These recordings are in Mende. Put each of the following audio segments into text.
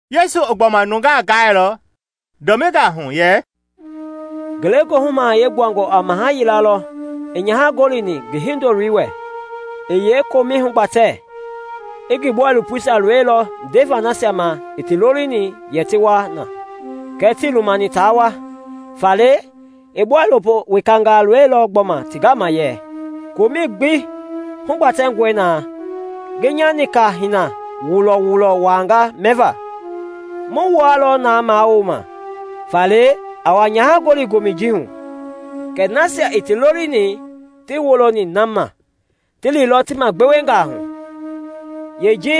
Yesu i gbɔma nungaa gaailɔ dɔmingaa hu yɛ, “Ngelegoohu Mahayɛi gbuangɔ a maha yila lɔ i nyaha gɔlini ngi hindoloi wɛ, i yeekomɛi hugbatɛ. I ngi bɔilopoisia loilɔ ndeva nasia ma i ti lolini yɛ ti wa na, kɛɛ tii lumani taa wa. Faale i bɔilopo wekangaa loilɔ gbɔma ti gama yɛ, ‘Komɛi gbi hugbatɛngɔe na; ngi nya nika-hina wulɔ-wulɔisia waanga mɛva; mu wua lɔ naa mawuloma; faale a wa nyaha gɔli gomɛ ji hu.’ Kɛɛ nasia i ti lolini tii woloni na ma, ti liilɔ ti magbewengaa hu: yeeji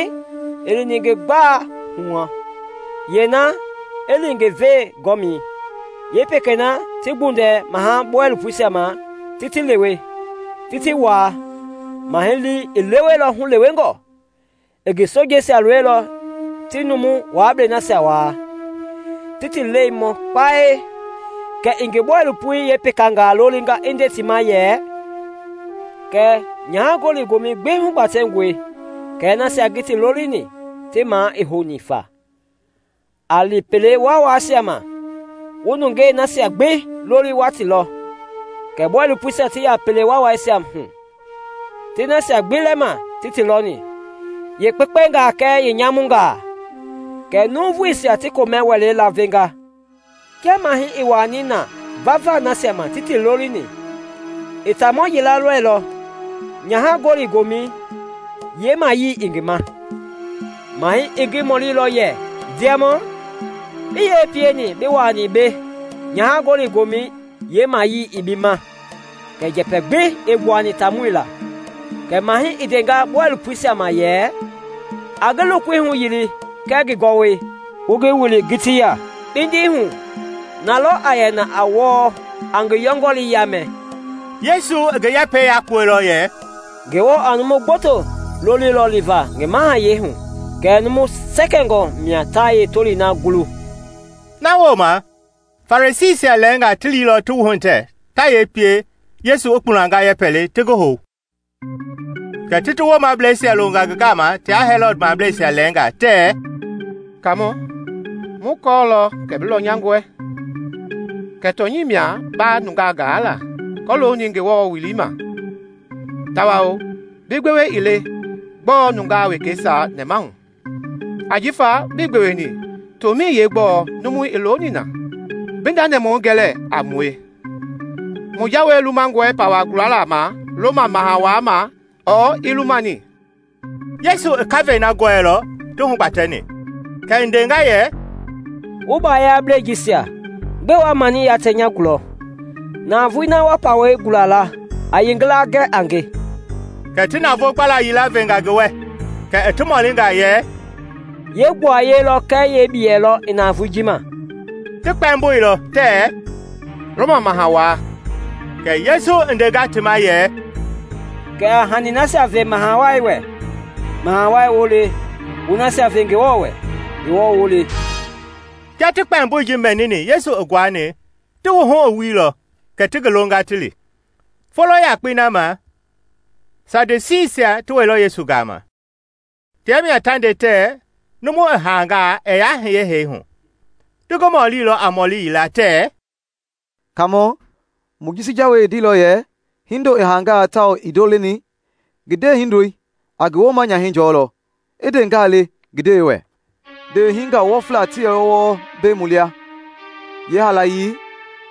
i li ngi gbalei hu, yeena i li ngi velegɔmɛi, yeepekeisia ti gbundɛ mahɛi bɔilopoisia ma, ti ti lewe, ti ti waa. Mahɛi lii i leweilɔ hulewengɔ; i ngi sojeisia loilɔ ti numu waablei nasia waa, ti ti lɛi mɔ kpae. Kɛ i ngi bɔilopoi yeepekangaa lolinga i nde ti ma yɛ, ‘Nyaha-gɔli-gomɛi gbi hugbatɛngɔe kɛɛ nasia ngi ti lolini ti maa i houni fa. A li pele waawaisia ma wu nungei nasia gbi loli wa ti lɔ.’ Kɛ bɔilopoisia ti ya pele waawaisia hu ti nasia gbi lɛma ti ti lɔni, yeekpekpengaa kɛɛ yeenyamungaa, kɛ nuuvuisia ti komɛ-wɛlei lavenga. “Kia mahɛi i wuaani na vava nasia ma ti ti lolini, i taamɔ yila lɔilɔ na nyaha-gɔli-gomɛi yeemayii ii ngi ma. Mahɛi i ngi mɔlilɔ yɛ, ‘Ndiamɔ, bi yee pieni bi wuaani mbei nyaha-gɔli-gomɛi yeemayii ii bi ma?’ Kɛɛ njɛpɛ gbi ii gbuani taamɔi laa. Kɛ mahɛi i ndenga bɔilopoisia ma yɛ, ‘A ngi lokoi huyili kɛɛ ngi gɔwɔi, wu ngi wili ngitii ya, kpindi hu. Na lɔ a yɛ na a wɔɔ, a ngi yɔngɔlii yaamɛ.’” Yesu i ngi yɛpɛi yakpuɛilɔ yɛ, “Ngewɔ a numu gboto lɔ loli liva ngi mahayɛi hu kɛɛ numu sɛkɛngɔ mia ta yeetolii woi gulu.” Na wooma Farisiisia lɛɛnga ti liilɔ ti wuhitɛ ta yee pie Yesu i kpulanga yɛpɛ le ti ngi hou. Kɛ ti ti woomableisia longa ngi gama tia Hɛlɔd mableisia lɛɛnga tɛɛ, “Kaamɔ, mu kɔɔlɔ kɛ bi lɔnyangɔe, kɛ tɔnyɛi mia ba nungaa gaa la kɔlooni Ngewɔ welei ma, tawao bi gbewe ii le gbɔɔ i nungaa wekeisia nɛmahu; ajifa bii gbeweni tomɛi yeegbɔɔ numu i looni na. Bi nda nɛmahui gɛ lɛɛ a mue. Mu jawei lumangɔe pawa gulalei ma Roma Maha Wai ma ɔɔ ii lumani?” Yesu i kavɛi na gɔɛilɔ ti hugbatɛni, kɛ i ndenga yɛ, “Wu baayablɛi jisia, gbɛe wa mani yatɛ nya gulɔ? Navoei na wa pawɛi gula la a yeengila gɛ a nge.” Kɛ ti navoo gbala yila venga ngi wɛ. Kɛ i ti mɔlinga yɛ, “Yee gbuaye lɔ kɛɛ ngi biyei i navoei ji ma?” Ti kpɛmboilɔ tɛɛ, “Roma Maha Wai.” Kɛ Yesu i ndenga ti ma yɛ, “Kɛ a hani nasia ve Maha Wai wɛ Maha Wai woo le, wu nasia ve Ngewɔ wɛ Ngewɔ woo le.” Kia ti kpɛmboi ji mɛnini Yesu i nguani, ti wuhu i wuilɔ kɛ ti ngi longa ti li. Folo yakpei na ma Sadusiisia ti wɛilɔ Yesu gama. Tia mia ta nde tɛɛ numu i haangaa ɛɛ yaa hiye hee hu. Ti ngi mɔlilɔ a mɔli yila tɛɛ, “Kaamɔ, Mojisi jawei i ndeilɔ yɛ, ‘Hindo i haangaa tawao ii ndo leni, ngi ndewehindoi a ngi wooma-nyahɛi jɔlɔ, i ndeengaa le ngi ndewei wɛ.’ Ndeewehingaa wɔfla ti yɛlɔ wɔɔ mbei mu lia. Yeehaalayei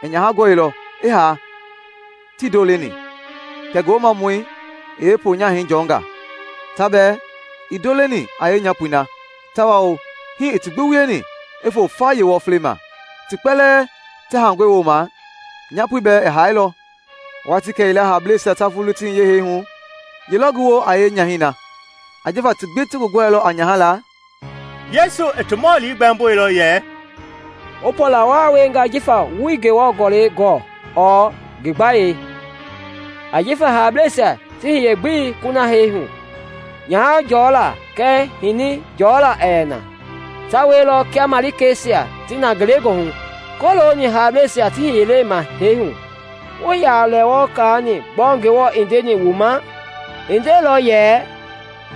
i nyaha gɔilɔ, i haa, tii ndo leni, kɛ ngi woomamɔi i yeeponyahɛi jɔnga. Ta bɛɛ ii ndo leni a nyapoi na tawao hii i ti gbi wieni i fo fa yeewɔflei ma. Ti kpɛlɛɛ ti haangɔi wooma, nyaapoi bɛɛ i haailɔ. Watii kɛyila haableisia ta vulu ti hiye hee hu, ye lɔ ngi woo a yɛ a nyahɛi na? Ajifa ti gbi ti ngi gɔɛilɔ a nyaha laa?” Yesu i ti mɔli gbɛmboilɔ yɛ, “Wu pɔɔla waa wienga jifa wuii Ngewɔ Gɔlɛisia gɔ ɔɔ ngi gbayei. Ajifa haableisia ti hiye-gbelei kuna hee hu, nyaha jɔlaa kɛɛ hini jɔlaa ɛɛ yɛ na, ta wielɔ kia malikeisia ti na ngelegoohu. Kɔlooni haableisia ti hiyelei ma hee hu, wuii yaa lɛ wɔɔ kaani gbɔɔ Ngewɔ i ndeni wu ma? I ndeilɔ yɛ,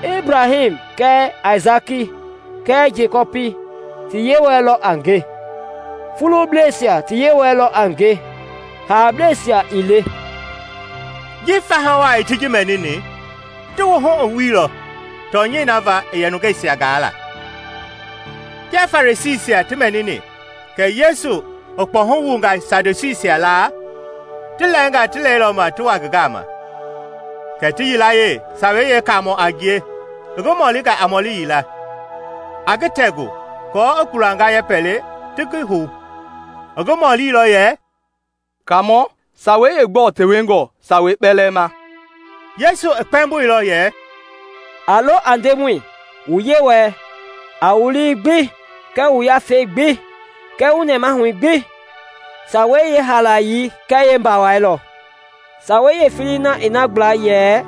‘Ebraham kɛɛ Aisaki kɛɛ Jekɔpi ti Yewɔɛi lɔ a nge’? Fubleisia ti Yewɔ lɔ a ngie, haableisia ii le.” Ji faha wai ti ji mɛnini, ti wuhu i wuilɔ tɔnyɛi na va i yɛ nungeisia gaa la. Kia Farisiisia ti mɛnini kɛ Yesu i kpɔhu wunga Sadusiisia laa, ti lɛɛnga ti lɛilɔ ma ti wa ngi gama, kɛ ti yilayee, Sawei Yeekaamɔ a ngie, i ngi mɔlinga a mɔli yila, a ngi tɛgu aako i kpulanga yɛpɛ le ti ngi hou. I ngi mɔlilɔ yɛ, “Kaamɔ, sawei yeegbɔɔ tewengɔ sawei kpɛlɛɛ ma?” Yesu i kpɛmboilɔ yɛ, “A lo a Ndemɔi, wu Yewɔɛi, a wu lii gbi kɛɛ wu yafei gbi kɛɛ wu nɛmahui gbi. Sawei yeehaalayei kɛɛ yeembawai lɔ. Sawei yeefelei na i na gbla yɛ,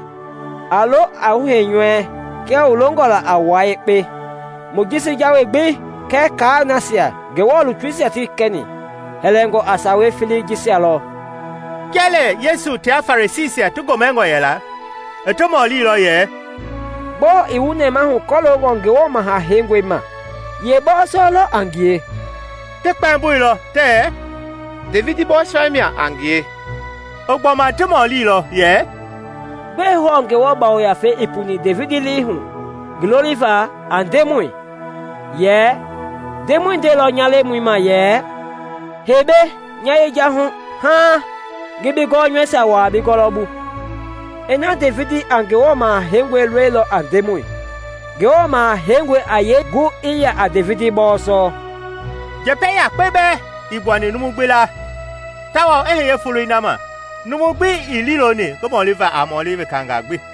‘A lo a wu heinyɔui kia wu longɔ la a wua yekpe.’ Mojisi Jawei gbi kɛɛ kaai nasia Ngewɔ lutuisia ti kɛni, hɛlɛngɔ a sawa felei jisia lɔ.” Kia lɛ Yesu tia Farisiisia ti gomɛngɔ yɛla, i ti mɔlilɔ yɛ, “Gbɔɔ i wu nɛmahu kɔlooni Ngewɔ Maha Heingɔi ma? Ye bɔɔsɔ lɔ a ngie?” Ti kpɛmboilɔ tɛɛ, “Devidi bɔɔsɔ mia a ngie.” I gbɔma ti mɔlilɔ yɛ, “Gbɛe hɔɔ Ngewɔ Yafei i puni Devidi lii hu ngi loliva a ‘Ndemɔi’? Yɛ, ‘Ndemɔi ndeilɔ nya Lemɔi ma yɛ, Hei mbei nya yejahui haaŋ ngi bi gɔnyɔuisia wuaa bi gɔwɔbu.’ “Ina Devidi a Ngewɔ Maha Heingɔi loli a ‘Ndemɔi’, Ngewɔ Maha Heingɔi a yee gu i yɛ a Devidi bɔɔsɔ?” Njɛpɛ yakpe bɛɛ ii gbuani numu gbi laa tawao i hiye foloi na ma numu gb i ii liiloni ngi mɔliva a mɔɔli wekangaa gbi.